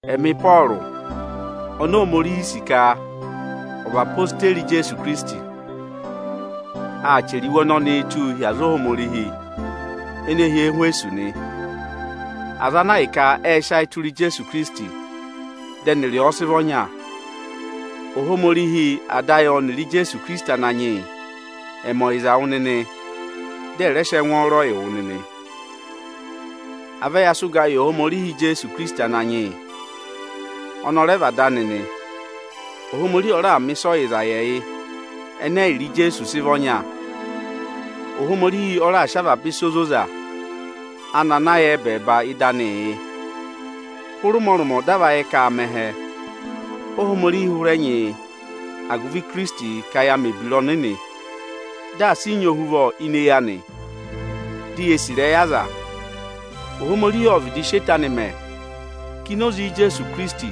Ẹmị Ịpọọrụ oni Ohomorihi nyị ka ọ̀ vị odeyi Ijeesu Ikirisiti, ọ chẹrẹ iwe ọnọnị tụ́ hi aza Ohomorihi ene hi Ẹhwẹsọsị nị, aza ana ahịka ẹ́ẹ sị ayị tụra Ijeesu Ikirisiti, dị ẹnịrị ọ sị vị ọnya. Ohomorihi Ada ayị ọnịrị Ijeesu Ikirisiti Ananyị yị ẹ̀ mẹ ọyịza yị wụ nịnị, dị ẹ̀ rẹ sị ẹngwọọrọ yị wụ nịnị. À vẹ ya sị ụga yị Ohomorihi Ijeesu Ikirisiti Ananyị yị, ọnị ọ rẹ vị Ada anị nị. Ohomorihi ọ raà mẹ̀ ịsa ọyịza yị ẹyị ẹnẹ ẹyịrị Ijeesu sị vị ọnya. Ohomorihi ọ raà sị avaba ịsa ozoza anị ana yà ẹbẹẹba ịdị anịị yị. Hụrị ụmọrụmọ dị a va yẹ ka aa mẹ ẹhẹ, Ohomorihi hụrẹ nyị yị agụvị Ikirisiti ka ya mẹ̀ ebira ọnịnị, dị asị ị nyị ohuvọ ini eyi anị, di yee sì ịrẹyị aza nị. Ohomorihi ộ vịdị sị eto anị mẹ ka ini oze Ijeesu Ikirisiti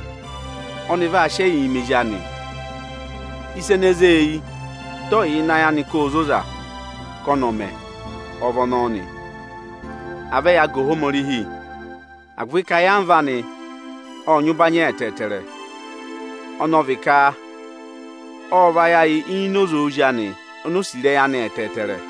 ọnị vaa sị ẹyịị mẹ ezi anị. Ịsa ene zé e eyi, dị ọ yẹ ịnị ayị anị ka óo zoza ka ọnị ọ̀ mẹ ọ vị ọnọọ nị. À vẹ yaa ga Ohomorihi, agụvị ka ayamva anị ọ́ọ nyị ụbanyị ẹtẹẹtẹrẹ, ọnị ọ vị ka ộ vayị ayị ini oze Ozi anị oni o sì ịrẹyị anị ẹtẹẹtẹrẹ.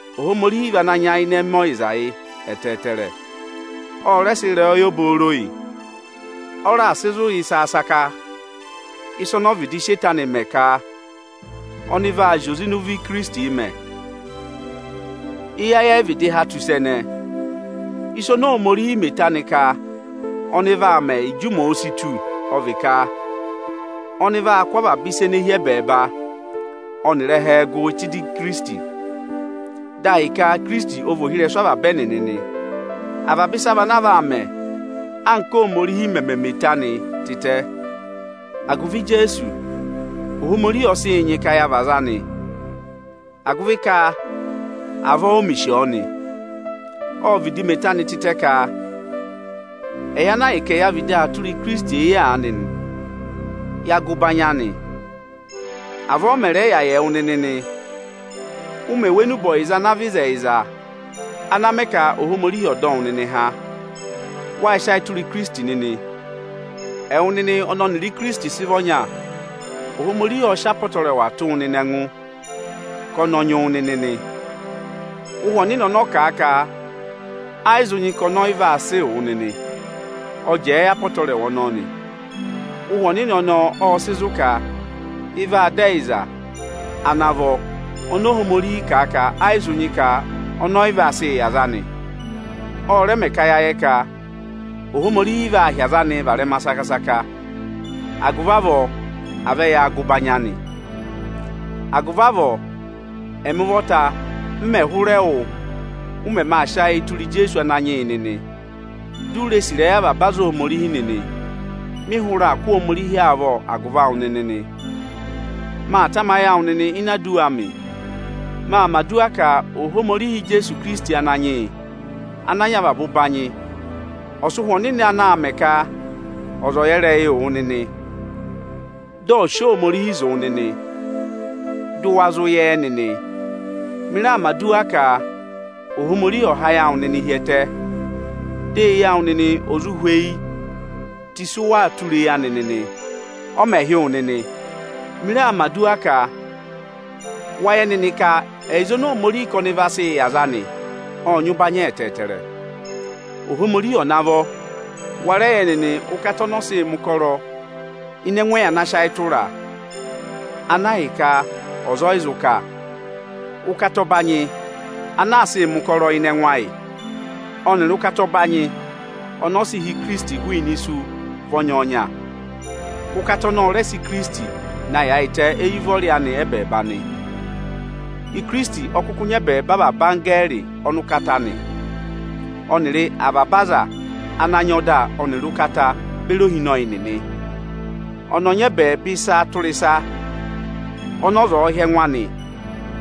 Ohomorihi vị ana nyayịnẹ mẹ ọyịza yị ẹtẹẹtẹrẹ. Ộ rẹ sị ịrẹyọyẹ obooro yị. Ọ raà sị zụ̀ yị saka-saka, ịsị ọnị ọ vịdị sị eto anị mẹ ka ọnị vaa zị oze ịnị ụvọ Ikirisitii mẹ; eyi ayị ẹ yị vịdị há tù ịsa ẹnẹẹ. Ịsa oni Ohomorihi mẹ eto anị ka ọnị vaa mẹ ịjị ụmẹ òo si tù ọ vị ka, ọnị vaa kụ́ avaba ịsa ene hi ẹbẹẹba ọnịrị ẹhẹẹ gụ tụ́ ịdị Ikirisiti nị. Dị ahịka Ikirisiti ọ vị ka Ikirisiti ọ vị ohirẹsụ avaba ẹnịnị nị. Avaba ịsa vị ana vaa mẹ anka Ohomorihi mẹ̀ mẹ eto anị tịtẹ. Agụvị Ijeesu, Ohomorihi ọ sị yị nyị ka ya vị aza anị, agụvị ka avọọ o mè sì ọ nị. Ộ vịdị mẹ eto anị tịtẹ ka ẹyị ana ahịka ẹya vịdị aa tụra Ikirisiti eyi aanị nị, ya ga ụbanyị Ohomorihi. Avọọ ọ mẹ̀ rẹ yà yị ẹwụ nịnị nị. Ụ mẹ̀ wụ́ enube ọyịza ana vị ịzẹyịza ana mẹ ka Ohomorihi ọ̀ dọ wụ nịnị há, wá sị ayị tụra Ikirisiti nịnị. Ẹwụ nịnị ọnị ọnịrị Ikirisiti sị vị ọnya, Ohomorihi ộ sị apọtẹrẹwa tụ́ wụ nịnị ẹngụ ka ọnị ọ nyị wụ nịnị nị. Ụhwẹ Ọnịnị ọnị ọ kà a ka ẹ yị zụ nyị ka ọnị ọ yị vaa sịị wụ ọ jẹẹ yị apọtẹrẹwa ọnọọ nị. Ụhwẹ Ọnịnị ọnọọ ọ́ọ sị zụ ka ị vaa dọ ẹyịza ana vọ oni Ohomorihi kà a ka ẹ yị zụ nyị ka ọnị ọ yị vaa sịị yị aza anị. Ọ rẹ mẹ ka ya yẹ ka Ohomorihi vaa hị́ aza anịị varẹma saka-saka. Agụvị avọọ à vẹ yaa ga ụbanyị anị. Agụvị avọọ, ẹ́mị ụvọta mẹ̀ hụrẹ wụ́, ụ mẹmẹ aa sị ayịị tụra Ijeesu Ananyị yị nịnị, di u ree sì ịrẹyị avaba aza Ohomorihi nịnị, mị hụrẹ aa kụ́ Ohomorihi avọọ agụvị awụ nịnị nị. Maa tamayị awụ nịnị ini aduwa amị. Maa mẹ̀ aduwa ka Ohomorihi Ijeesu Ikirisiti Ananyị yị ana nyị avaba ụbanyị ọ̀ sị Ụhwẹ Ọnịnị anaā mẹ ka ọza ọ̀ yẹ ịrẹyịị wụ nịnị; dị ọ̀ sị Ohomorihi zụ̀ wụ nịnị, dị ụ wa zụ yẹ ẹ nịnị. Mị raa mẹ̀ aduwa ka Ohomorihi ọ̀ há ayị awụ nịnị hi ẹtẹ, di eyi awụ nịnị ò zụ hweyi tù ịsị ụ waa tụra eyi anị nịnị, ọ mẹ̀ hị́ wụ nịnị. Mị raa mẹ̀ aduwa ka wa yẹ nịnị ka ẹyịza oni Ohomorihi ka ọnị vaa sịị yị aza anị ọ́ọ nyị ụbanyị ẹtẹẹtẹrẹ. Ohomorihi ọ̀ navọ wa rẹ yẹ nịnị ụkata ọnị ọ sịị mẹ̀ ụkọrọ ịnị ẹngụ ẹyị ana sị ayị tụra a, ana hi ka ọza ọ yị zụ kà. Ụkata ọbanyị ana aa sịị mẹ̀ ụkọrọ ịnị ẹngụ ayị ọnịrị ụkata ọbanyị ọnị ọ sị há Ikirisiti hụụnị isu vị ọnyọọnya. Ụkata ọnọọ ọ rẹ sị sị Ikirisiti na yaayịtẹ éyi ụvọrị anị ẹ́bẹẹba nị. Ikirisiti ọ kụkụ nyị ẹbẹẹba avaba anggẹẹrị ọnụkata nị, ọnịrị avaba aza ana nyị ọda ọnịrị ụkata beri ohinọyị nịnị nị. Ọnị ọ nyị ẹbẹẹba ịsa tụra ịsa ọnị ọza ọ̀ọ hị́ ẹngụ anị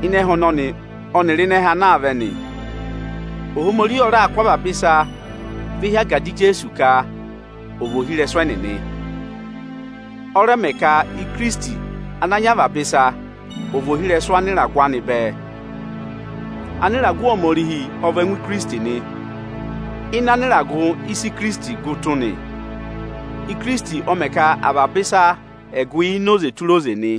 ịnị ẹhẹ ọnọnị ọnịrị ịnị ẹhẹ ana aa vẹ nị. Ohomorihi ọ raà kụ́ avaba ịsa ve hi agada Ijeesu ka ọ̀ vị ohirẹsụ ẹnịnị. Ọ rẹ mẹ ka Ikirisiti ana nyị avaba ịsa ọ̀ vị ohirẹsụ anịragụ anị bẹẹ. Anịragụ Ohomorihi ọ vị ẹngụ Ikirisiti nị. Ịnị anịragụ, ị́sa Ikirisiti gụ tụ́ nị. Ikirisiti ọ mẹ ka avaba ịsa ẹ̀ gụ ini oze tura oze nị.